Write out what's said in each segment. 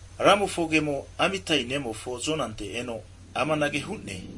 Ramo'a Amitai nemofo Jonana, amanage huno asamine,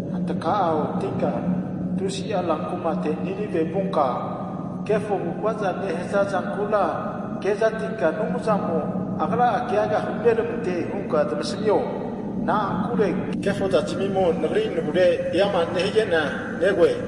hantaka'a otinka, tusi'a ra kumate Ninive vunka, kefo avu'ava nehaza zankura kezatinka Anumzamo, Anumzamo'a keaga hunermante hunka zamasmio, na'ankure kefoza zamimo'a Nagri navure eama nehige'na negoe.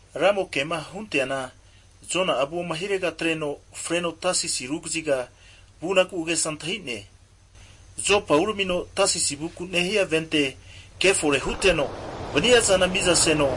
Ramo, Jonama ke hunteno, vuoma hirega atreno freno Tasisi atreno vunaku agesa antahi'ne, Jopa uramino Tasisi vuku nehia vente kefore huteno, vania zana mizaseno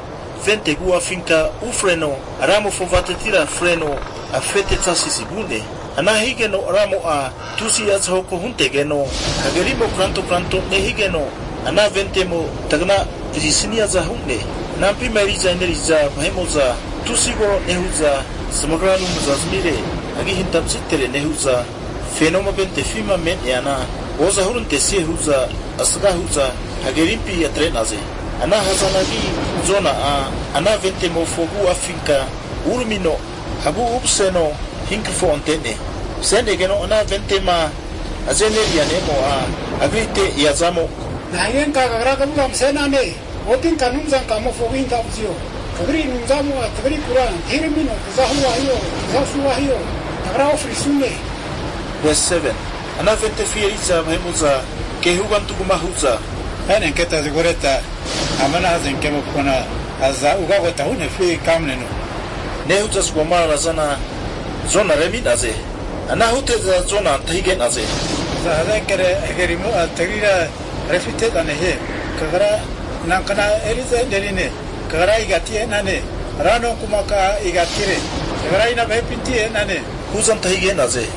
ventefi mrerino, Ramofo avatetira freno, afete Tasisi vu'ne. Ana higeno Ramo'a tusi'a zaho ko huntegeno hagerimo kranto kranto nehigeno ana ventemo tgana vaziza hu'ne. Anampima eri'za e'neriza vahe'mo'za (sailors) tusi koro nehu'za zamagra anumaza zamire agihanta vazitere nehu'za fenoma ventefima me'neana o'za hurantesie hu'za asgahu'za hage rimpi atre'naze. Ana hazanagi, Jona'a ana ventemofo agu'afi fenka uramino avu uvaseno, hinkrafo ante'ne. Vase'negeno ana ventema azeneria ne'mo'a agrite eazamo, Nahigenka kagra kavura mase'nane? Otinka anumzankamofo agihanta vazio, kagri anumzamo'a tagrikura antahiramino tza hugahio, taza osugahio, tagra ofrisune! Ana ventefi eri'za vahe'mo'za ke hugantu kma hu'za, E'nenketa zgoa reta, ama'na hazenke'mofona aza ugagota hu'nefi kamneno, nehu'za zgoma razana Jona remi'naze. Ana hute'za Jonana antahige'naze, aza hzenkere hagerimo'a tagrira refite'zana nehie? Kagra nankna eri'za e'nerine? Kagra igati e'nane? Ra nonkuma ka'a igatire? Kagra ina vahe'pinti e'nane? Hu'za antahige'naze.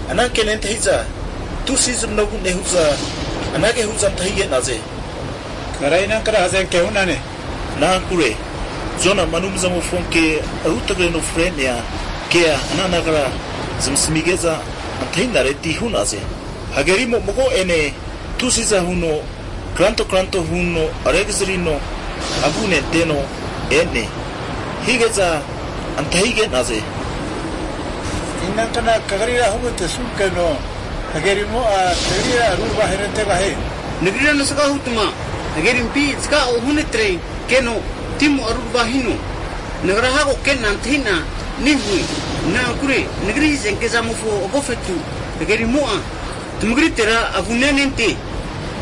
Ana ke nentahi'za, tusi zamanogu nehu'za, anage hu'za antahige'naze, Kagra inankna hazenke hu'nane? Na'ankure Jona'ma Anumzamofo ke rutagreno fre'nea kea, ana nagara zamasmige'za antahi'nareti hu'naze. Hagerimo'a mago'ene tusiza huno kranto kranto huno regzarino avune ante'no e'ne. Hige'za antahige'naze, Inankna kagrira hugante sunkeno hage rimo'a tagrira rurva herante'gahie? Nagrira nasgahutma hage rimpi matevu natrenkeno, timo'a rurava hino. Nagra hago ke'na antahi'na nehue, na'ankure nagri hzenke zamofo agofetu hage rimo'a tamagritera avunea nente,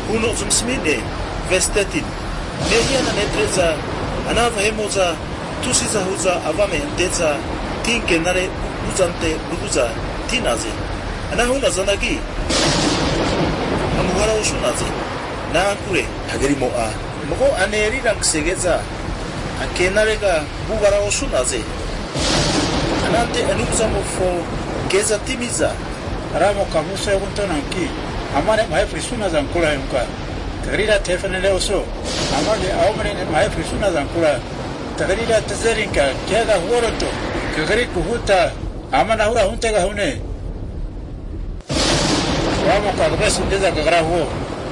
huno zamasmi'ne. Nehiana netre'za ana vahe'mo'za tusiza hu'za avame ante'za tin ankenare vu'zante mraguzati'naze. Ana hu'nazanagi, amuhara osu'naze, na'ankure hagerimo'a mago'ane erirankasege'za ankenarega vugara osu'naze. Anante Anumzamofo kezatimi'za, Ramoka muse (plis) hugantonanki ama ne'ma hae frisuna zankure hunka tagrira tahe fanane osuo. Ama, ke'a omne ne'ma hae frisuna zankura, tagrira tazerinka kegaga huoranto, Kagriku huta amanahura huntegahune, Ramoka kavesiniaza Kagra huo.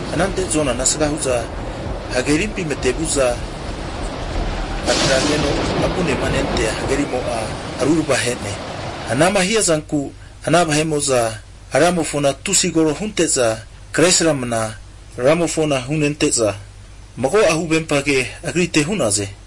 Anante Jonana asgahu'za hage rimpi matevu'za atrageno, avunema nentea hagerimo'a aru rva he'ne. Anama hiazanku ana vahemo'za, Ramofona tusi'a koro hunte'za, kre sramna Ramofona hunente'za, mago'a huvempa ke Agrite hu'naze.